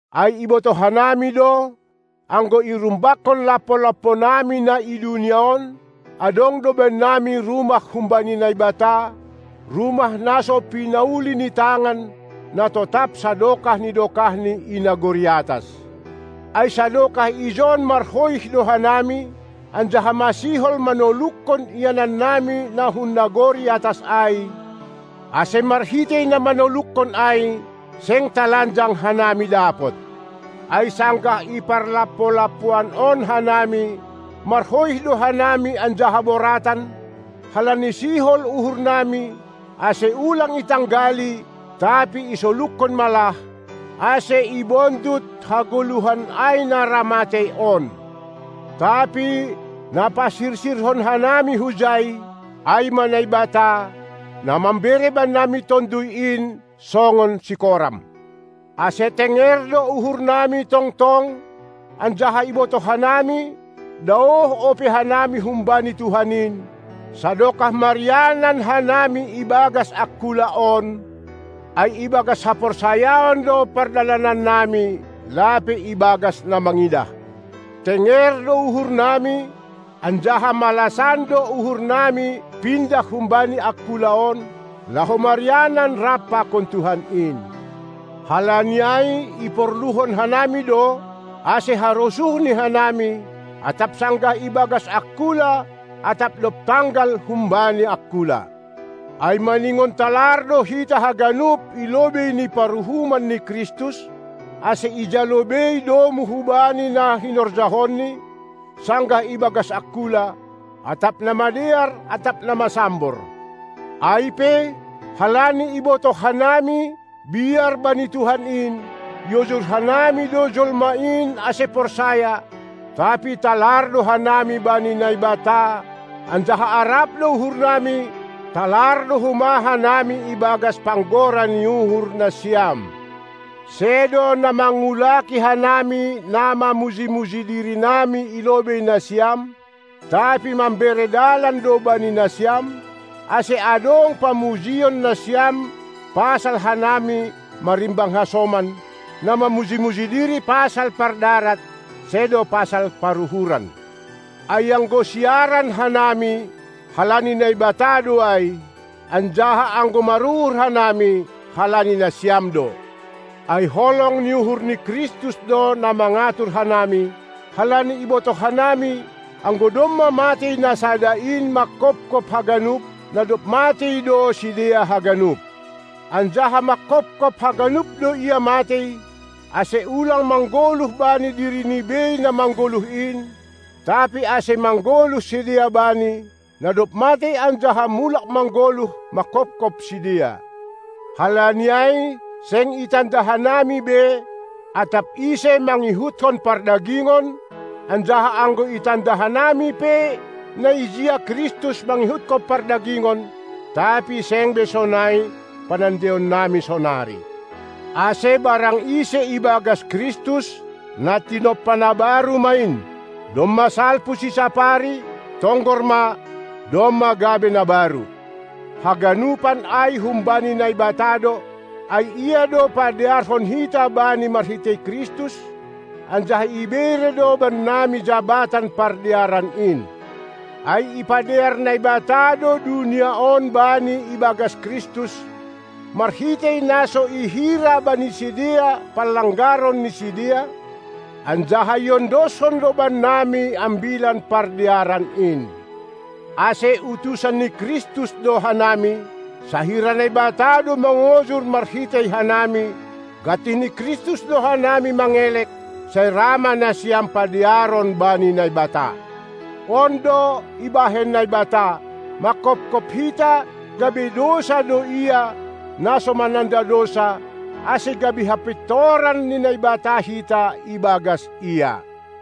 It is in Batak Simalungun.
Ai ibotoh hanami do, anggo irumbakkon lampo-lamponami na i dunia on, adong do bannami rumah humbani Naibata, rumah na so pinauli ni tangan, na totap sadokah ni dokahni i nagori atas. Ai sadokah ijon marhoih do hanami, anjaha masihol manolukkon ianannami na hun nagori atas ai, ase marhitei na manolukkon ai, seng talanjang hanami dapot. Ai sanggah i parlampo-lampoan on hanami, marhoih do hanami anjaha boratan, halani sihol uhurnami, ase ulang itanggali, tapi isolukkon ma lah, ase ibondut hagoluhan ai na ra matei on. Tapi na pasirsirhon hanami hujai, ai ma Naibata, na mambere bannami Tonduy in songon sikoram. Ase tenger do uhurnami tongtong, anjaha ibotoh hanami, daoh ope hanami humbani Tuhan in, sadokah marianan hanami ibagas angkula on, ai ibagas haporsayaon do pardalanannami, lape ibagas na mangidah. Tenger do uhurnami, anjaha malasan do uhurnami pindah humbani angkula on, laho marianan rap pakon Tuhan in. Halani ai iporluhon hanami do, ase harosuhNi hanami, atap sanggah ibagas angkula atap dob tanggal humbani angkula. Ai maningon talar do hita haganup i lobei ni paruhuman ni Kristus, ase ijalo bei domu hubani na hinorjahonni, sanggah ibagas angkula, atap na madear atap na masambor. Ai pe, halani ibotoh hanami, biar bani Tuhan in, iojur hanami do jolma in ase porsaya; tapi talar do hanami bani Naibata, anjaha arap do uhurnami, talar do homa hanami ibagas panggora ni uhur nasiam. Sedo na mangulaki hanami na mamuji-muji dirinami i lobei nasiam, tapi mambere dalan do bani nasiam, ase adong pamujion nasiam pasal hanami marimbang hasoman, na mamuji-muji diri pasal pardarat sedo pasal paruhuran. Ai anggo siaran hanami, halani Naibata do ai; anjaha anggo maruhur hanami, halani nasiam do. Ai holong ni uhur ni Kristus do na mangatur hanami, halani ibotoh hanami, anggo domma matei Na sada in manghophop haganup, na dob matei do sidea haganup. Anjaha manghophop haganup do Ia matei, ase ulang manggoluh bani dirini bei na manggoluh in, tapi ase manggoluh sidea Bani, na dob matei anjaha mulak manggoluh manghophop sidea. Halani ai seng itanda hanami be atap ise mangihutkon pardagingon; anjaha anggo itanda hanami pe na ijia Kristus mangihutkon pardagingon, tapi seng be sonai panandaionnami sonari. Ase barang ise ibagas Kristus, na tinompa na baru ma in. Domma salpu sisapari, tonggor ma, domma gabe na baru. Haganupan ai humbani Naibata do; ai Ia do padearhon hita Bani marhitei Kristus, anjaha ibere do bannami jabatan pardearan in. Ai ipadear Naibata do dunia on Bani ibagas Kristus, marhitei na so i hira bani sidea panlanggaron ni sidea, anjaha iondoskon do bannami ambilan pardearan in. Ase utusan ni Kristus do hanami, sahira Naibata do mangojur marhitei hanami. Gantih ni Kristus do hanami mangelek: Sai ra ma nasiam padearon bani Naibata! On do ibahen Naibata: Manghopkop hita gabe dousa do Ia, na so mananda dousa, ase gabe hapintoran ni Naibata hita ibagas Ia.